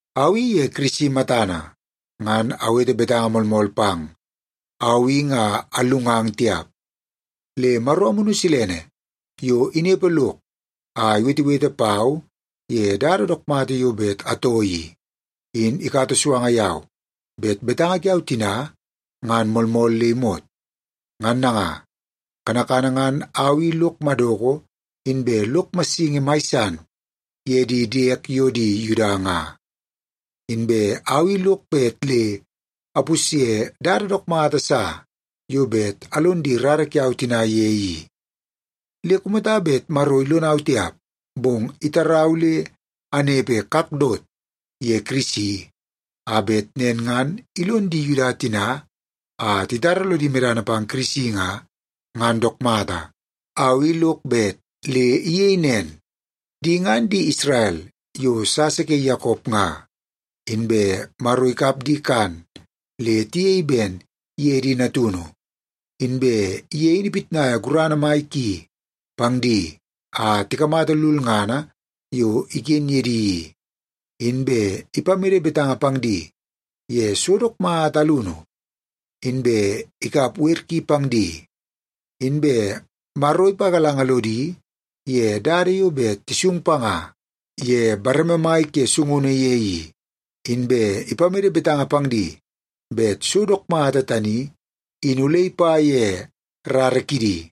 Au i ye Kirisi matana ngan awete betanga moolmool pang. Au i nga allungang tiap, le Maro Amunu Silene yo inepe lok a iwetewete pau ye dada dook mata yo bet atoo i, in ikata suanga yau bet betanga kiau tina ngan moolmool le imot. Ngan nanga, kanakana ngan au i lok madoko inbe lok massingi mai san ye di diek yo di Yuda nga. Inbe au i lok bet le apusye dada dook mata sa yo bet alon di rara kiau tina ye i. Le kumata bet Maro ilonau tiap, bong itarau le anepe kakdot ye Kirisi, a bet nen ngan ilon di Yuda tina a titara lodi medana pang Kirisi nga, ngan dook mata. Au i lok bet le iyei nen. Di ngan di Isrel yo sasa ke Yakop nga. Inbe Maro ikap di kan le tiyei ben ye di natunu, inbe ye in ipitnaia gurana mai ki pang di a tikamata lulngana yo iken ye di i. Inbe ipamede betanga pang di ye so dook mata alunu, inbe ikap wer ki pang di. Inbe Maro ipagalanga lodi ye dada yo bet tisung panga ye bareme mai ke sungunu ye i, inbe ipamede betanga pang di bet so dook mata tani in ole ipa ye rara kidi.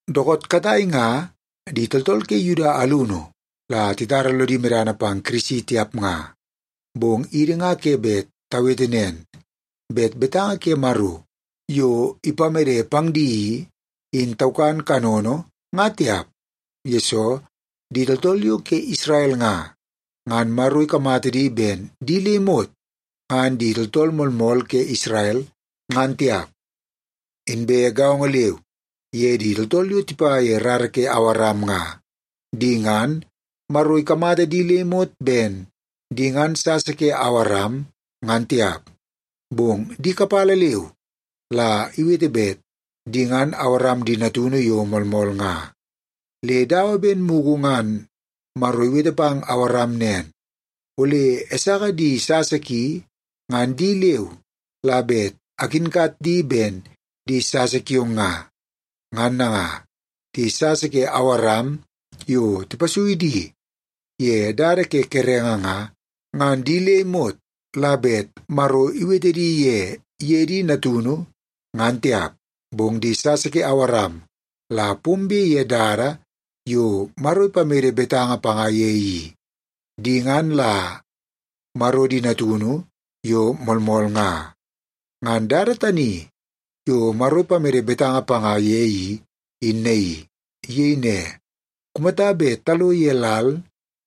Dookoot katai nga di tooltool ke Yuda alunu la titara lodi medana pang Kirisi tiap nga, bong idi nga ke bet tawete nen, bet betanga ke Maro yo ipamede pang di i, in taukan kanono nga tiap, yesoo di tooltool yo ke Isrel nga, ngan Maro ikamata di ben di le imot ngan di tooltool moolmool ke Isrel, ngan tiap. Inbe gaongo leu ye di tooltool yo tipa ye rara ke Awaram nga. Di ngan, Maro ikamata di le imot ben di ngan sasa ke Awaram, ngan tiap, bong di kapala leu la iwete bet di ngan Awaram di natunu yo moolmool nga. Le dawa ben mugu ngan Maro iwete pang Awaram nen, “Ole Esaka di sasa ki, ngan di leu la bet akinkat di ben di sasa kiong nga.” Ngan nanga, di sasa ke Awaram yo tipasui di ye dada ke kerenge nga, ngan di le imot la bet Maro iwete di ye ye taunu di natunu, ngan tiap. Bong di sasa ke Awaram la pombe ye dada yo Maro ipamede betanga panga ye i, di ngan la Maro di natunu yo moolmool nga. Ngan dada tani yo Maro ipamede betanga panga ye i, in naii. Iyei ne, “Kumata bet talo ye lal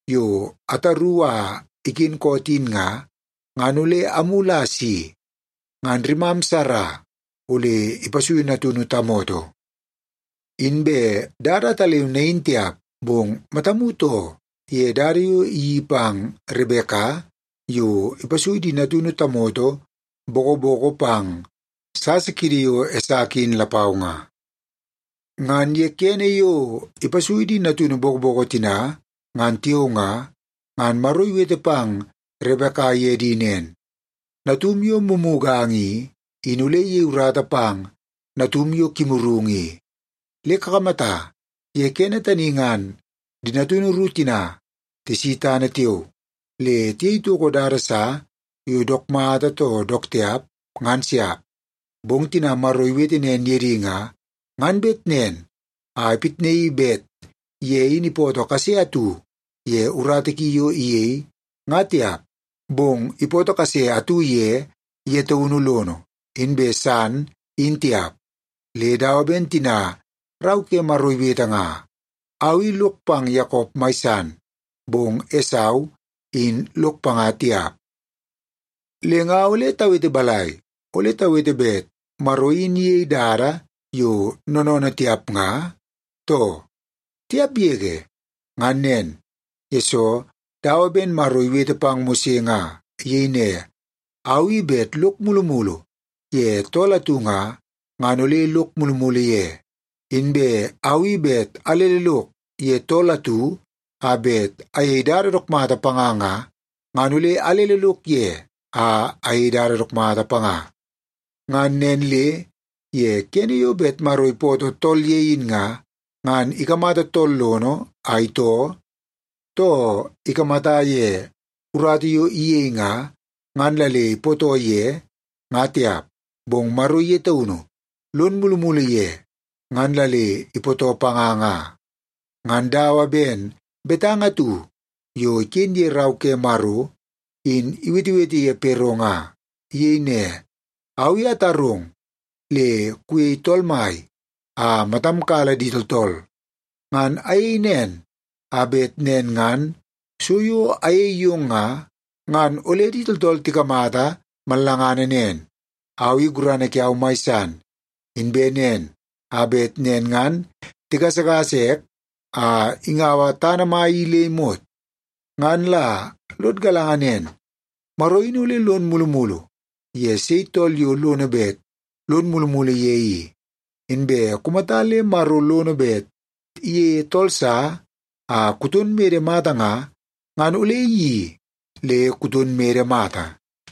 yo ataru a iken koot in nga, ngan ole amulu a asi, ngan rimam Sara ole ipasuiu natunu tamoto.” Inbe dada ataleu nain tiap, bong matamu too ye dada yo iyeii pang Rebeka yo ipasui di natunu tamoto bokoboko pang sasa kiidi yo Esaka in lapau nga. Ngan ye kene yo ipasui di natunu bokoboko tina ngan tiao nga, ngan Maro iwete pang Rebeka ye di nen, “Natum yo mumuganga i, in ole iyei urata pang natum yo kimurungu i.” Le kakamata, ye kene tani ngan di natunu ru tina tisi tana tiao, le tiyei toko dada sa yo dook mata too dook tiap, ngan siap. Bong tina Maro iwete nen ye di nga, ngan bet nen a ipitnaii bet ye in ipootoo kase atu ye urata ki yo iyei, nga tiap, bong ipootoo kase atu ye ye taunu lono, inbe san in tiap. Le dawa ben tina Rau ke Maro iwete nga, “Au i lok pang Yakop mai san, bong Esau in lok panga tiap.” Le nga ole tawete balai? Ole tawete bet Maro in iyei dada yo noonoonoo tiap nga, too? Tiap yege! Ngan nen, yesoo dawa ben Maro iwete pang Mose nga. Iyei ne, “Au i bet lok mulumulu ye tool atu nga, ngan ole lok mulumulu ye. Inbe au i bet alele lok ye tool atu a bet ayei dada dook mata panga nga, ngan ole alele lok ye a ayei dada dook mata panga.” Ngan nen le ye kene yo bet Maro ipootoo tool ye in nga, ngan ikamata tool lono a itoo, too ikamata ye urata yo iyei nga, ngan la le ipootoo ye, nga tiap. Bong Maro ye taunu lon mulumulu ye ngan la le ipootoo panga nga. Ngan dawa ben betanga atu yo iken ye Rau ke Maro, in iwetewete ye Pero nga. Iyei ne, “Au i atarong le kuyei tool mai a matam kala di tooltool. Ngan ayei nen, a bet nen ngan so yo ayei yong nga, ngan ole di tooltool tikamata mallangana nen, au i gurana kiau mai san. Inbe nen, a bet nen ngan tigasagasa ek a ingaua tana mai i le imot.” Ngan la lod galanga nen, Maro in ole lon mulumulu ye sei tool yo lono bet lon mulumulu ye i. Inbe kumata le Maro lono bet iyeie tool sa a kuton mede mata nga, ngan ole iyeii le kuton mede mata.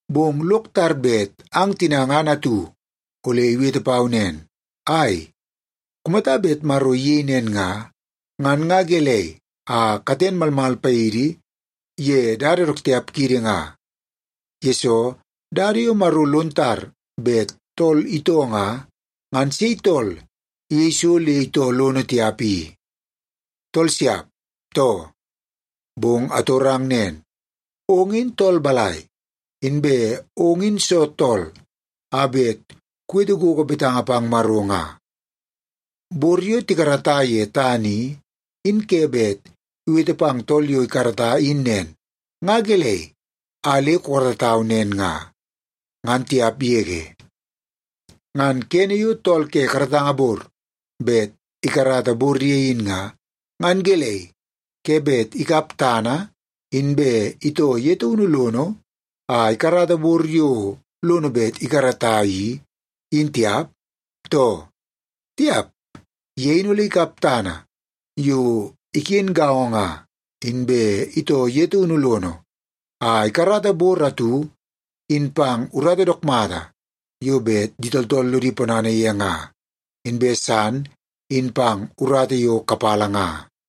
Bong lok tar bet ang tina ngan atu ole iwete pau nen, “Ai, kumata bet Maro iyei nen nga, ngan nga gelei a katen malmal paidi ye dada dook tiap kiidi nga? Yesoo, dada yo Maro lon tar bet tool itoo nga, ngan sei tool iyei so le itoo lono tiap i? Tool siap, too?” Bong atorong nen, ong in tool balai, inbe ong in soo tool a bet kuwete gogo betanga pang Maro nga? Bor yo tikarata ye tana i, in ke bet iwete pang tool yo ikarata in nen, “Nga gelei a le kukaratau nen nga?” ngan tiap yege. Ngan kene yo tool ke karatanga bor bet ikarata bor ye in nga, ngan gelei, ke bet ikap tana inbe itoo ye taunu lono a ikarata bor yo lono bet ikarata i, in tiap, too? Tiap! Ye in ole ikap tana yo iken gaongo nga, inbe itoo ye taunu lono a ikarata bor atu in pang urata dook mata yo bet di tooltool lodi ponana ye nga, inbe san in pang urata yo kapala nga.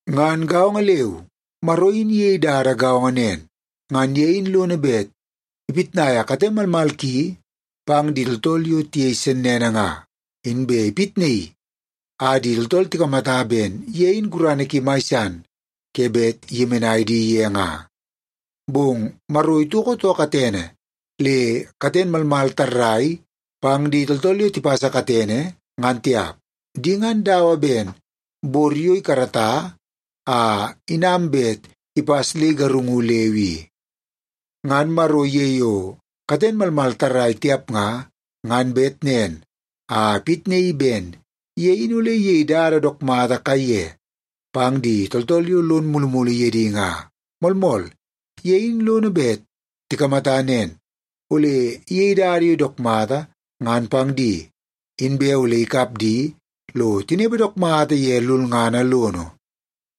Ngan gaongo leu, Maro in iyei dada gaongo nen. Ngan ye in lono bet ipitnaia kate malmal ki pang di tooltool yo tiyei sennene nga, inbe ipitnaii a di tooltool tikamata ben ye in gurana ki mai san ke bet iyemenai di ye nga. Bong Maro itoko too katene le katen malmal tarrai pang di tooltool yo tipasa katene, ngan tiap. Di ngan dawa ben bor yo ikarata a inam bet ipas le igarungu leu i. Ngan Maro ye yo katen malmal tarrai tiap nga, ngan bet nen a ipitnaii ben ye in ole iyei dada dook mata kaiye pang di tooltool yo lon mulumulu ye di nga. Moolmool, ye in lono bet tikamata nen; ole iyei dada yo dook mata ngan pang di, inbe ole ikap di lo tinepe dook mata ye lulngana lono.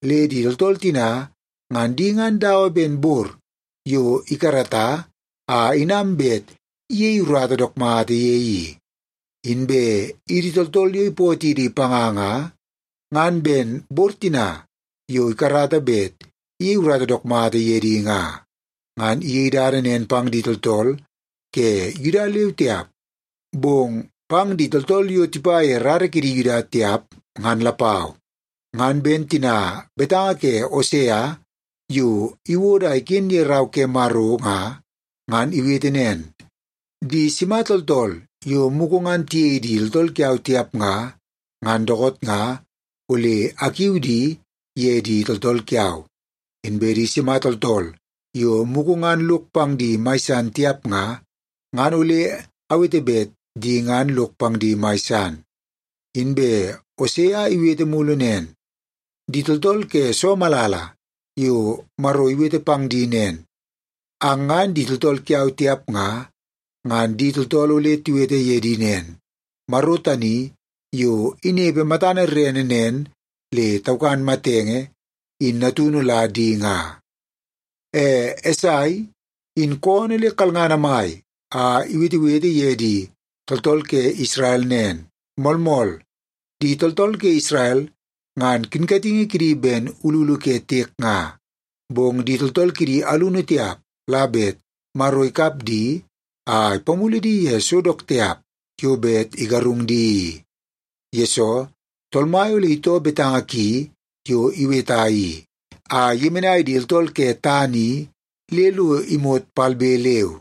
Le di tooltool tina, ngan di ngan dawa ben bor yo ikarata a inam bet iyei urata dook mata ye i. Inbe idi tooltool yo ipootidi panga nga, ngan ben bor tina yo ikarata bet iyei urata dook mata ye di nga. Ngan iyei dada nen pang di tooltool ke Yuda leu tiap, bong pang di tooltool yo tipa ye rara kidi Yuda tiap, ngan lapau. Ngan ben tina betanga ke Osea yo iwodo a iken ye Rau ke Maro nga. Ngan iwete nen, “Di sima tooltool yo mugu ngan tiyei di tooltool kiau tiap nga, ngan dookoot nga ole akiu di ye di tooltool kiau. Inbe di sima tooltool yo mugu ngan lok pang di mai san tiap nga, ngan ole awete bet di ngan lok pang di mai san.” Inbe Osea iwete mulu nen, “Di tooltool ke soo malala yo Maro iwete pang di nen, ‘Ang ngan di tooltool kiau tiap nga,’ ngan di tooltool ole tiwete ye di nen, ‘Maro tani yo inepe matana rerene nen le taukan matenge in natunu la di nga.’” E Esai, in koonoo le kalngana mai a iwetewete ye di tooltool ke Isrel nen, “Moolmool, di tooltool ke Isrel ngan kinkatingi kidi ben ululu ke tiek nga, bong di tooltool kidi alunu tiap la bet Maro ikap di a ipamulu di ye so dook tiap yo bet igarungu di i. Yesoo, Tool Mai ole itoo betanga ki yo iweta i, a iyemenai di tooltool ke tana i le lo imot palbe leu.”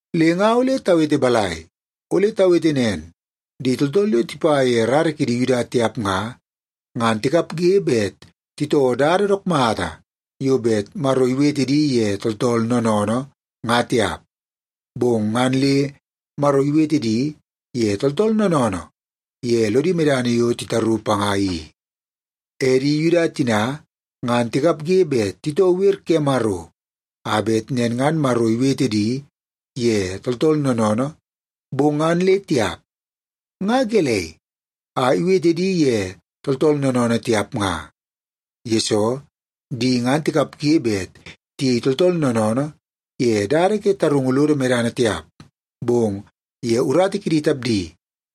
Le nga ole tawete balai? Ole tawete nen, di tooltool yo tipa ye rara kidi Yuda tiap nga, ngan tikapge bet titoo dada dook mata yo bet Maro iwete di ye tooltool noonoonoo, nga tiap, bong ngan le Maro iwete di ye tooltool noonoonoo ye lodi medana yo titaru panga i. E di Yuda tina ngan tikapge bet titoo wer ke Maro a bet nen ngan Maro iwete di ye tooltool noonoonoo, bong ngan le tiap. Nga gelei a iwete di ye tooltool noonoonoo tiap nga? Yesoo, di ngan tikapge bet tiyei tooltool noonoonoo ye dada ke tarungu lodi medana tiap, bong ye urata kidi tapdi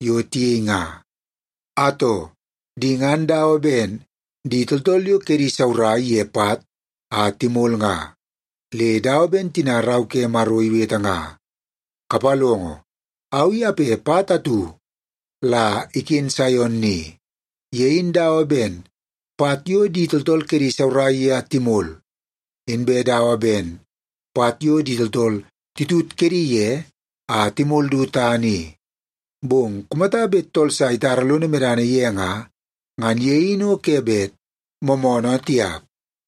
yo tiyei nga. Atoo, di ngan dawa ben di tooltool yo kedi saurai ye pat a timol nga. Le dawa ben tina Rau ke Maro iwete nga, “Kapalongo, au i ape pat atu la iken Saion ni. Ye in dawa ben pat yo di tooltool kedi isaurai ye a timol, inbe dawa ben pat yo di tooltool titut kedi ye a timol du tana i. Bong kumata bet tool sa itara lono medana ye nga, ngan ye in o ke bet moomoonoo tiap.”